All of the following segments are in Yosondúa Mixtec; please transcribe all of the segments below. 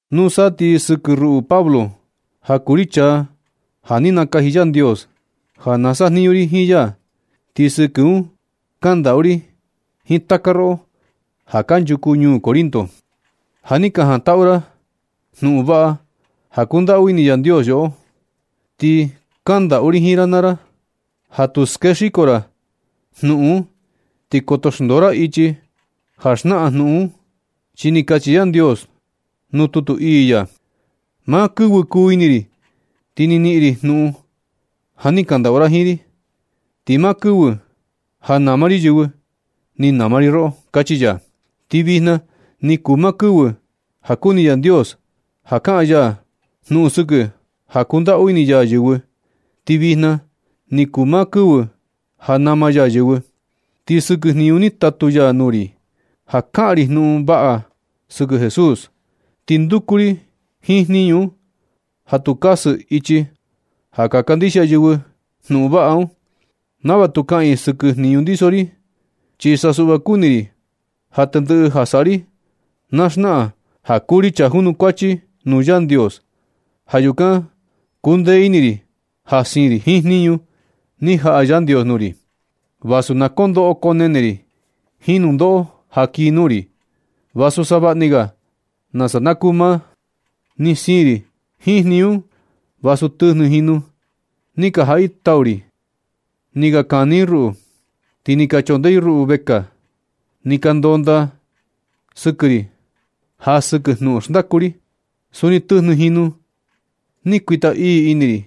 Nusa ti sɨkɨ ruꞌu Pablo, ja kuu ri chaa ja ni nakaji Yandios ja na sajniñu ri jiin ya, ti sɨkɨ un kandaꞌu ri jiin taka roꞌo, ja kanchuku ñuu Corinto, ja ni ka jantaꞌu ra jnuꞌun vaꞌa ja kundaꞌu ini Yandios yoꞌo. Ti kandaꞌu ri jiin ra naa ra ja tu skexiko ra jnuꞌun un ti koto xndoo ra ichi ja xnaꞌan jnuꞌun un. Chi ni kachi Yandios nuu tutu ii ya: Maa kɨvɨ kuu ini ri ti ni niꞌin ri jnuꞌun ja ni kandaꞌu ra jiin ri. Ti maa kɨvɨ ja nama ri yɨvɨ, ni nama ri roꞌo. Kachi ya. Ti vijna ni kuu maa kɨvɨ ja kuni Yandios ja kaꞌan ya jnuꞌun sɨkɨ ja kundaꞌu ini ya yɨvɨ. Ti vijna ni kuu maa kɨvɨ ja nama ya yɨvɨ. Ti sɨkɨ jniñu ni tatu ya nuu ri, ja kaꞌan ri jnuꞌun vaꞌa ga sɨkɨ Jesús, ti nduku ri jiin jniñu un ja tu kasɨ ichi ja ka kandixia yɨvɨ jnuꞌun vaꞌa un, nava tu kaꞌan i sɨkɨ jniñu ndiso ri. Chi sa suꞌva kuni ri ja tendɨꞌɨ ja saꞌa ri na xnaꞌan ja kuu ri chaa junukuachi nuu Yandios. Ja yukan kundee ini ri ja siin ri jiin jniñu ni jaꞌa Yandios nuu ri, vasu na koo ndoꞌo koo nene ri jiin nundoꞌo ja kii nuu ri, vasu savaꞌni ga nasa na kuu maa. Ni siin ri jiin jniñu un vasu tɨjnɨ jinu ni ka jaꞌa i tau ri ni ka kani i ruꞌu, ti ni ka chondee i ruꞌu vekaa, ni ka ndondaa i sɨkɨ ri ja sɨkɨ jnuꞌun xndaku ri. Suni tɨjnɨ jinu ni kuita ii ini ri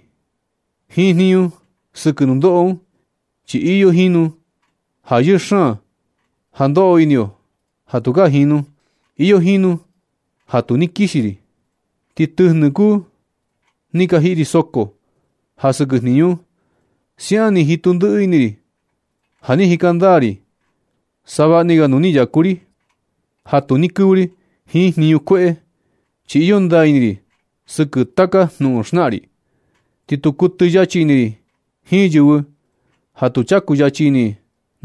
jiin jniñu sɨkɨ nundoꞌo un, chi iyo jinu ja yɨɨ xaan ja ndoꞌo ini yo ja tukaa jinu. Iyo jinu ja tu ni kixi ri. Ti tɨjnɨ kuu ni ka jiꞌi ri soko ja sɨkɨ jniñu un. Siaꞌan ni jitu ndiꞌi ini ri ja ni jika ndaa ri savaꞌni ga nuu ni yaku ri ja tu ni kɨvɨ ri jiin jniñu kueꞌe. Chi iyo ndaa ini ri sɨkɨ taka jnuꞌun xnaꞌan ri. Ti tu kuɨtɨ yachi ini ri jiin yɨvɨ ja tu chaku yachi ini i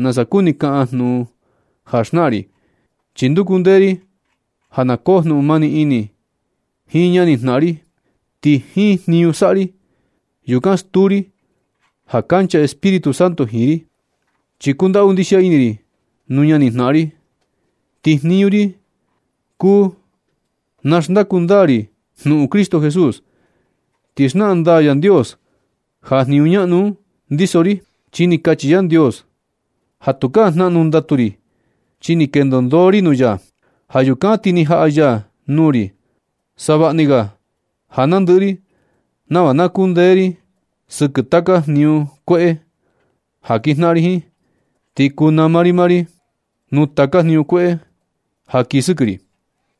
nasa kuni kaꞌan jnuꞌun ja xnaꞌan ri. Ti nduku ndee ri ja na koo jnuꞌun mani ini jiin ñani jnaꞌan ri. Ti jiin jniñu saꞌa ri, yukan stuu ri ja kancha Espíritu Santo jiin ri. Chi kundaꞌu ndixia ini ri nuu ñani jnaꞌan ri. Ti jniñu ri kuu na xndaku ndaa ri jnuꞌun Cristo Jesús. Ti xnaꞌan ndaa Yandios ja jniñu ñaꞌnu un ndiso ri. Chi ni kachi Yandios ja tukaa jnaꞌnu ndatu ri, chi ni kendo ndoo ri nuu ya. Ja yukan ti ni jaꞌa ya nuu ri savaꞌni ga ja nandɨꞌɨ ri nava na kundee ri sɨkɨ taka jniñu kueꞌe ja ka kinjnaꞌan ri jiin, ti kuu nama ri maa ri nuu taka jniñu kueꞌe ja kii sɨkɨ ri.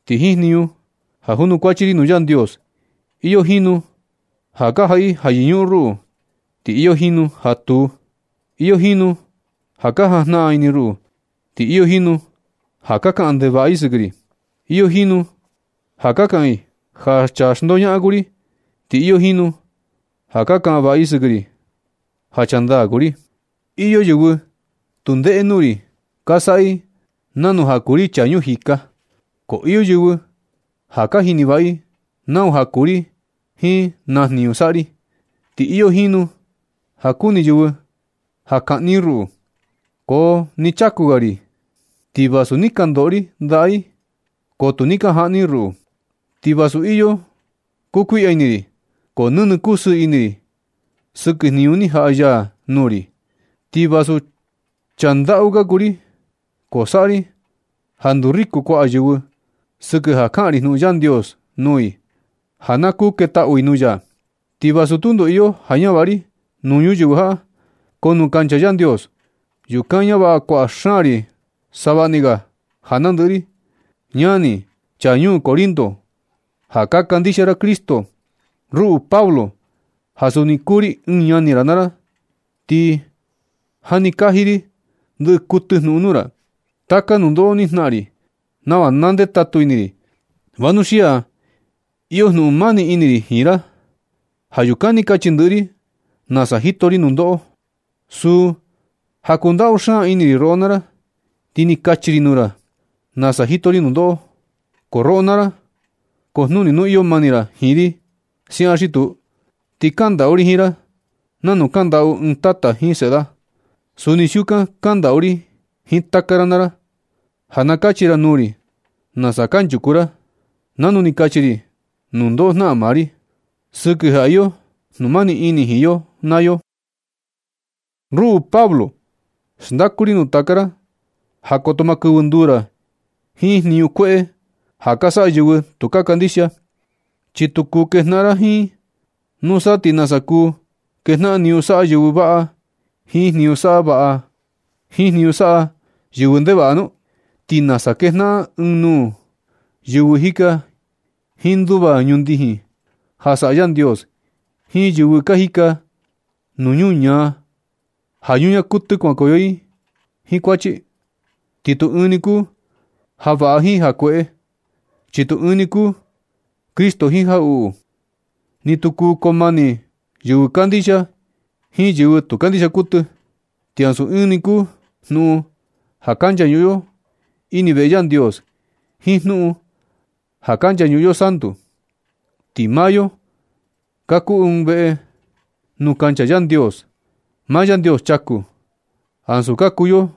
Ti jiin jniñu ja junukuachi ri nuu Yandios, iyo jinu ja ka jaꞌa i ja yɨñuꞌun ruꞌu, ti iyo jinu ja tuu. Iyo jinu ja ka jajnaꞌan ini ruꞌu, ti iyo jinu ja ka kaꞌan ndevaꞌa i sɨkɨ ri. Iyo jinu ja kaꞌan i ja chaa xndoñaꞌan kuu ri, ti iyo jinu ka kaꞌan vaꞌa i sɨkɨ ri ja chaa ndaa kuu ri. Iyo yɨvɨ tu ndeꞌe nuu ri, ka saꞌa i nanu ja kuu ri chaa ñuu jika, ko iyo yɨvɨ ja ka jini vaꞌa i nau ja kuu ri jiin na jniñu saꞌa ri. Ti iyo jinu ka kuni yɨvɨ ja kaꞌni i ruꞌu, ko nɨ chaku ga ri. Ti vasu ni ka ndoꞌo ri ndaꞌa i, ko tu ni ka jaꞌni i ruꞌu. Ti vasu iyo kukuiꞌya ini ri, ko nɨnɨ kusɨɨ ini ri sɨkɨ jniñu ni jaꞌa ya nuu ri. Ti vasu chaa ndaꞌu ka kuu ri, ko saꞌa ri ja nduu riku kuaꞌa yɨvɨ sɨkɨ ja kaꞌan ri jnuꞌun Yandios nuu i ja na kuu ketaꞌu i nuu ya. Ti vasu tundo iyo ja ñavaꞌa ri nuu ñuyɨvɨ jaꞌa, ko nuu kancha Yandios, yukan ñavaꞌa kuaꞌa xaan ri savaꞌni ga ja nandɨꞌɨ ri. Ñani, chaa ñuu Corinto ja ka kandixia ra Cristo, ruꞌu Pablo, ja suni kuu ri ɨɨn ñani ra naa ra, ni jani kaji ri ndɨ kuɨtɨ jnuꞌun nuu ra taka nundoꞌo ni jnaꞌan ri, nava na ndetatu ini ri, vanuxia iyo jnuꞌun mani ini ri jiin ra. Ja yukan ni kachi ndɨꞌɨ ri nasa jito ri nundoꞌo. Suu ja kundaꞌu xaan ini ri roꞌo naa ra, ti ni kachi kaji ri nuu ra nasa jito ri nundoꞌo, ko roꞌo naa ra kojnuni nu iyo mani ra jiin ri siaꞌan xi tuu. Ti kandaꞌu ri jiin ra nanu kandaꞌu ɨɨn tata jiin seꞌe da. Suni siukan kandaꞌu ri jiin taka ra naa ra, ja na kachi ra nuu ri nasa kanchuku ra, nanu ni kachi ri nundoꞌo jnaꞌan maa ri, sɨkɨ ja iyo jnumani ini jiin yo naa yo. Ruꞌu Pablo, xndaku ri nuu taka ra ja koto maa kɨvɨ nduu ra jiin jniñu kueꞌe ja ka saꞌa yɨvɨ tu ka kandixia, chi tu kuu kejnaꞌan ra jiin i. ¿Nusa ti nasa kuu kejnaꞌan jniñu saꞌa yɨvɨ vaꞌa jiin jniñu saꞌa yɨvɨ ndevaꞌa nu? ¿Ti nasa kejnaꞌan ɨɨn nuu yɨvɨ jika jiin nduva ñundijin ja saꞌa Yandios jiin yɨvɨ ka jika nuu ñuñaa, ja ñuñaa kuɨtɨ kuankoyo i jiin kuachi? Ti tu ɨɨn ni kuu ja vaꞌa jiin ja kueꞌe, chi tu ɨɨn ni kuu Cristo jiin jaꞌuꞌu. Ni tu kuu koo mani yɨvɨ kandixia jiin yɨvɨ tu kandixia kuɨtɨ. Ti ansu ɨɨn ni kuu jnuꞌun ja ka nchañuꞌun yo ini veꞌe Yandios jiin jnuꞌun ja kunchañuꞌun yo santu. Ti maa yo ka kuu ɨɨn veꞌe nuu kancha Yandios, maa Yandios chaku, ansu ka kuu yo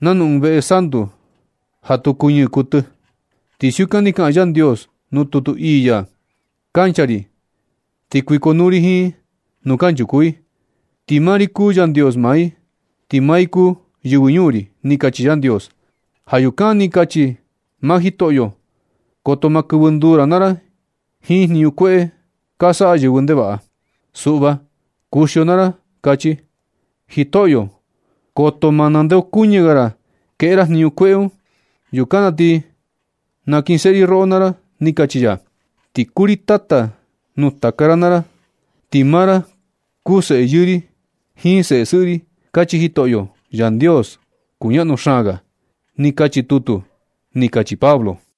nanu ɨɨn veꞌe santu ja tu kuñɨɨ kuɨtɨ. Chi siukan ni kaꞌan Yandios nuu tutu ii ya: Kuncha ri ti kuikonuu ri jiin i nuu kanchuku i. Ti maa ri kuu Yandios maa i, ti maa i kuu yɨvɨ ñuu ri. Ni kachi Yandios. Ja yukan ni kachi maa Jitoꞌyo, koto maa kɨvɨ nduu ra naa ra jiin jniñu kueꞌe ka saꞌa yɨvɨ ndevaꞌa. Suꞌva kuxio naa ra, kachi Jitoꞌyo. Koto maa nandeokuñɨ ga ra kueꞌe ra jniñu kueꞌe un. Yukan na ti nakinseꞌe ri roꞌo naa ra, ni kachi ya. Ti kuu ri Tata nuu taka ra naa ra, ti maa ra kuu seꞌe yɨɨ ri jiin seꞌe sɨꞌɨ ri, kachi Jitoꞌyo, Yandios kuñaꞌnu xaan ga. Ni kachi tutu, kachi Pablo.